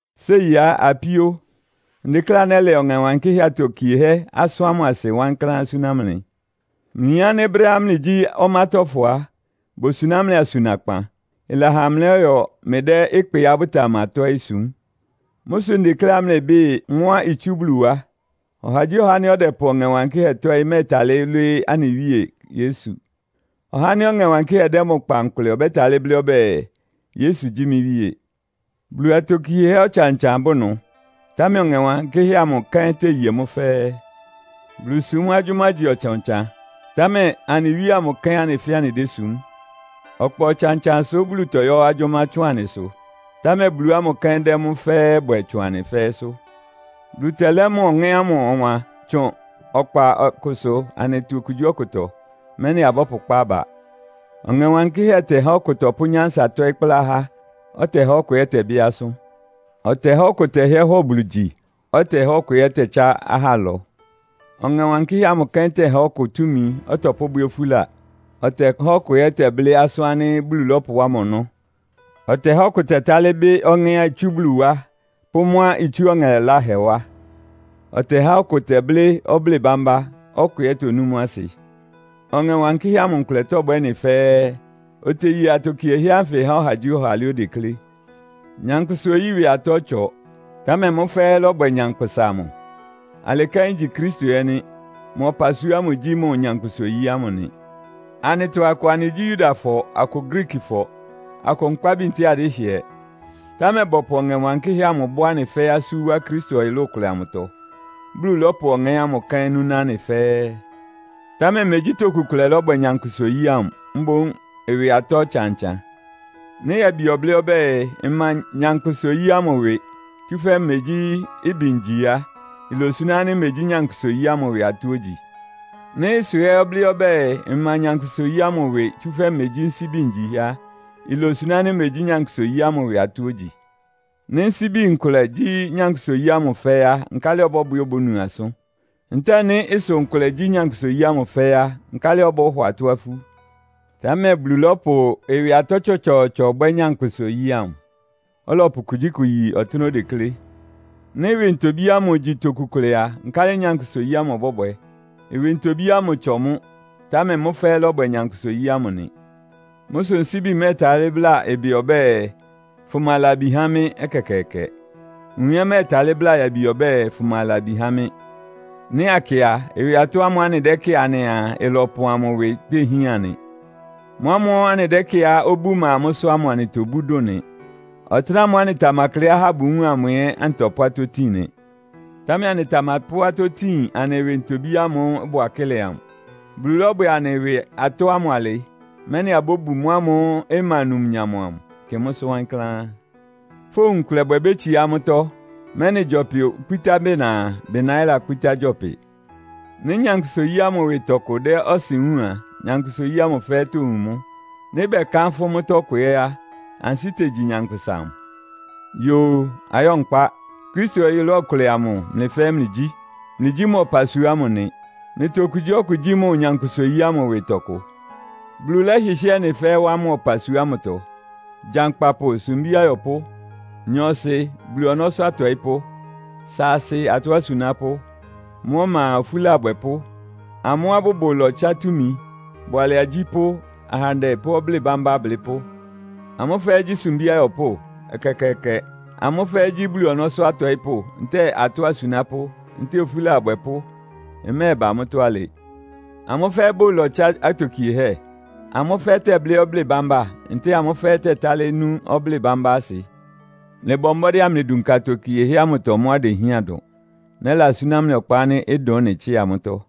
Séi á, apíó, ndekléá nɛ́lɛ Ɔŋɛ Wankɩ́hɛ́ atokiehɛ́ asʋ́n amʋ́ asɩ wankláán súná mlɩ. Mlɩyin ánɩ́ brɛ́á mlɩgyí ɔmátɔ́fɔ á, bosuná mlɩ asunakpan, ɩlɛha mlɩlɔ́yɔ mlɩdɛ́ ɩkpɩá bʋtamatɔ́ɩ́ sum. Mʋ́ sʋ ndekléá mlɩbɩ́ɩ mʋ́á itsú Bulu wá. Ɔhagyíɔha ánɩ́ ɔdɛpʋ Ɔŋɛ Wankɩ́hɛ́ tɔ́ɩ́ mɛ́ɛtalɩ́ lwɩ́ɩ́ anɩ Wíe Yesu. Ɔhá ánɩ́ Ɔŋɛ Wankɩ́hɛ́ dɛ́ mʋ kpa nkʋlɛ ɔbɛ́talɩ́ blɩ́ ɔbɛ́ɛ, “Yesu gyí mɩ́ Wíe.” Bulu atokiehɛ́ ɔtsan-ɔtsan bʋ ɩnʋ, támɛ Ɔŋɛ Wankɩ́hɛ́ amʋ kɛ́n teye mʋ́ fɛ́ɛ́. Bulusúm agyʋ́má igyi ɔtsan-ɔtsan, támɛ anɩ Wíe amʋ kɛ́n anɩ fɛ́ɛ́ anɩdésum. Ɔkpa ɔtsan-ɔtsansʋ Bulu tɔyɔ́ agyʋ́má tsʋn anɩsʋ, támɛ Bulu ámʋ kɛ́n dɛ́ mʋ́ fɛ́ɛ́ bwɛ tsʋn anɩ fɛ́ɛ́sʋ́. Bulu tɛlɛ́ mʋ Ɔŋɛ́ ámʋ ɔwan tsʋn ɔkpa ɔkʋsʋ anɩtɔ okugyíɔkʋtɔ, mɛ́nɩ abɔ́pʋkpá aba. Ɔŋɛ Wankɩ́hɛ́ tɛhá ɔkʋ tɔpʋ́ nyánsa tɔ́ɩ́ kplá ahá, ɔtɛhá ɔkʋ ɛ́ tɛbɩ́ asʋ́n. Ɔtɛhá ɔkʋ tɛhɩ́ɛ́ hɔ Bulu gyi, ɔtɛhá ɔkʋ ɛ́ tɛtsá ahá ɩlɔ. Ɔŋɛ Wankɩ́hɛ́ amʋ kɛ́n tɛhá ɔkʋ túmi ɔtɔpʋ́bwɛ́ ofúla, ɔtɛhá ɔkʋ ɛ́ tɛblɩ́ asʋ́n ánɩ́ Bulu lɔ́pʋwá mʋ ɔnɔ́. Ɔtɛhá ɔkʋ tɛtálɩ́ bɩ́ ɔŋɛ́á itsú Bulu wá pʋ́ mʋ́á itsú ɔŋɛ laláhɛ wá. Ɔtɛhá ɔkʋ tɛblɩ́ ɔblɩ́ɩ bámbá, ɔkʋ ɛ́ tonú mʋ́ asɩ. Ɔŋɛ Wankɩ́hɛ́ amʋ nkʋlɛ tɔ́bwɛ́ ɩ́nɩ fɛ́ɛ́, oteye atokiehɛ́ ánfɩ há ɔhagyíɔha alɩá odeklé. Nyankpʋsa-oyí ɩwɩ atɔ́ ɩtsɔ, támɛ mʋ́ fɛ́ɛ́ lɔ́bwɛ nyankpʋsa amʋ. Alɩ kɛ́n igyi Kristo ɛ́ nɩ́. Mʋ ɔpasua ámʋ gyí mʋ nyankpʋsa-oyí ámʋ nɩ. Anɩtɔ akʋ anɩgyí Yudafɔ, akʋ Griikifɔ, akʋ nkpábi ntɛ́ɛ adɩ́hɩɛ, támɛ bɔpʋ Ɔŋɛ Wankɩ́hɛ́ amʋ bɔ́ anɩ fɛ́ɛ́ asú wá Kristo ɔyʋlʋ́ʋ kʋlɛ amʋtɔ, Bulu lɔ́pʋ Ɔŋɛ́ ámʋ kɛ́n núná anɩ fɛ́ɛ́. Támɛ mégyí toku kʋlɛ lɔ́bwɛ nyankpʋsa-oyí ámʋ, mboún ɩwɩ atɔ́ ɔtsan-ɔtsan. Nɩ́ yabi ɔblɩ́ ɔbɛ́ɛ, “Mma nyankpʋsa-oyí ámʋ ɩwɩ, tsúfɛ́ megyí ɩbɩ ngyi” á, ilosuná ánɩ́ megyí nyankpʋsa-oyí ámʋ ɩwɩ atɔ́ ogyi? Nɩ́ ɩsʋ ɛ́ ɔblɩ́ ɔbɛ́ɛ, “Mma nyankpʋsa-oyí ámʋ ɩwɩ, tsúfɛ́ megyí nsíbi ngyi” á, ilosuná ánɩ́ megyí nyankpʋsa-oyí ámʋ ɩwɩ atɔ́ ogyi? Nɩ́ nsíbi nkʋlɛ gyí nyankpʋsa-oyí ámʋ fɛ́ɛ́ á, nkálɩ ɔbɔ́bwɛ obónu asʋ́n? Ntɛ́ɛ nɩ́ ɩsʋ nkʋlɛ gyí nyankpʋsa-oyí ámʋ fɛ́ɛ́ á, nkálɩ ɔbɔ́hɔ atɔ́ afú? Támɛ Bulu lɔ́pʋ ɩwɩ atɔ́ tsɔtsɔɔtsɔ bwɛ́ nyankpʋsa-oyí ámʋ, ɔlɔpʋ kugyíkʋ yi ɔtɩ́nɛ́á odeklé. Nɩ́ ɩwɩ ntobí ámʋ igyi toku kʋlɛ a, nkálɩ nyankpʋsa-oyí ámʋ ɩbɔ́bwɛ? Ɩwɩ ntobí ámʋ ɩtsɔ mʋ́, támɛ mʋ́ fɛ́ɛ́ lɔ́bwɛ nyankpʋsa-oyí amʋ nɩ. Mʋ́ sʋ nsíbi mɛ́ɛtalɩ́ bláa ɩbɩ ɔbɛ́ɛ, “Fʋma labi há mɩ́!” ɛkɛkɛɛkɛ. Nwun ɛ́ mɛ́ɛtalɩ́ bláa yabi ɔbɛ́ɛ, “Fʋma labi há mɩ́!” Nɩ́ akɩ a, ɩwɩ atɔ́ ámʋ́ʋ́ anɩdɛ́kɩ́ɩ anɩaa ɩlɔpɔn amʋ ɩwɩ téhían nɩ. Mʋ́ ámʋ́ʋ́ anɩdɛ́kɩ́ɩá obú ɩma mʋ́sʋ́ ámʋ anɩtobú dʋn nɩ. Ɔtɩ́nɛ́ ámʋ́ʋ́ anɩtamakleá ahá bʋwúun amʋ ɛ́ anɩtɔpʋ́ atɔ́ tin nɩ. Támɛ anɩtamapʋ́ atɔ́ tin anɩ ɩwɩ ntobí ámʋ́ʋ́ ɩbʋ akɩ́lɛ amʋ. Bulu lɔ́bwɛ anɩ ɩwɩ atɔ́ ámʋ alɩ, mɛ́nɩ abóbu mʋ́ ámʋ́ʋ́ ɩma numnyam amʋ, kɩ mʋ́sʋ́ wankláán. Fówun ɩkʋlɛbwɛ bétsiá amʋ́tɔ́, mɛ́nɩ gyɔpɩ okpítá bɩna a, bɩna ɛ́ lakpítá gyɔpɩ. Nɩ́ nyankpʋsa-oyí ámʋ ɩwɩ tɔkʋ dɛ́ ɔsɩn wúun a, nyankpʋsa-oyí ámʋ fɛ́ɛ́ towun mʋ́. Nɩ́ bɛkánfʋ́ mʋ́tɔ́ kʋ ɛ́ á, ansɩ́ tegyi nyankpʋsa amʋ. Yoo, ayɔ́ nkpá. Kristo ɔyʋlʋ́ʋ kʋlɛ amʋ mlɩ fɛ́ɛ́ mlɩgyí. Mlɩgyí mʋ ɔpasua ámʋ nɩ. Mlɩtɔ okugyíɔkʋ gyí mʋ nyankpʋsa-oyí ámʋ ɩwɩ tɔkʋ. Bulu lɛ́hɩhɩ́ɛ ɩ́nɩ fɛ́ɛ́ wá mʋ ɔpasua ámʋtɔ. Gyankpapʋ, sumbí ayɔpʋ́. Nyɔɔsɩ, Bulu ɔnɔ́sʋ́ atɔɩ́pʋ́, saasɩ, atɔ́ asunápʋ́. Mʋ́ ɔma a, ofúla abwɛpʋ́. Amʋ́á bʋbʋ ɩlɔtsá túmi, bʋalɛ agyípʋ́, ahandɛ pʋ́ ɔblɩ́ɩ bambá ablɩ́pʋ́. Amʋ́ fɛ́ɛ́ gyí sumbí ayɔpʋ́? Ɛkɛkɛɛkɛ! Amʋ́ fɛ́ɛ́ gyí Bulu ɔnɔ́sʋ́ atɔɩ́pʋ́, ntɛ́ɛ atɔ́ asunápʋ́, ntɛ́ɛ ofúla abwɛpʋ́? Ɩmɛ́ɛba mʋ́tɔ́ alɩ! Amʋ́ fɛ́ɛ́ bʋ ɩlɔtsá atokiehɛ́? Amʋ́ fɛ́ɛ́ tɛ́blɩ́ ɔblɩ́ɩ bambá, ntɛ́ɛ amʋ́ fɛ́ɛ́ tɛtálɩ́ nú ɔblɩ́ɩ bambá ámʋ asɩ? Mlɩbɔ mbɔ́dɩ́ amlɩdunka atokiehɛ́ ámʋtɔ mʋ́á idehián dʋn. Nɛ́lasúná mlɩ ɔkpa ánɩ́ ɩdʋn ɩ́nɩ tsɩ́a mʋ́tɔ́.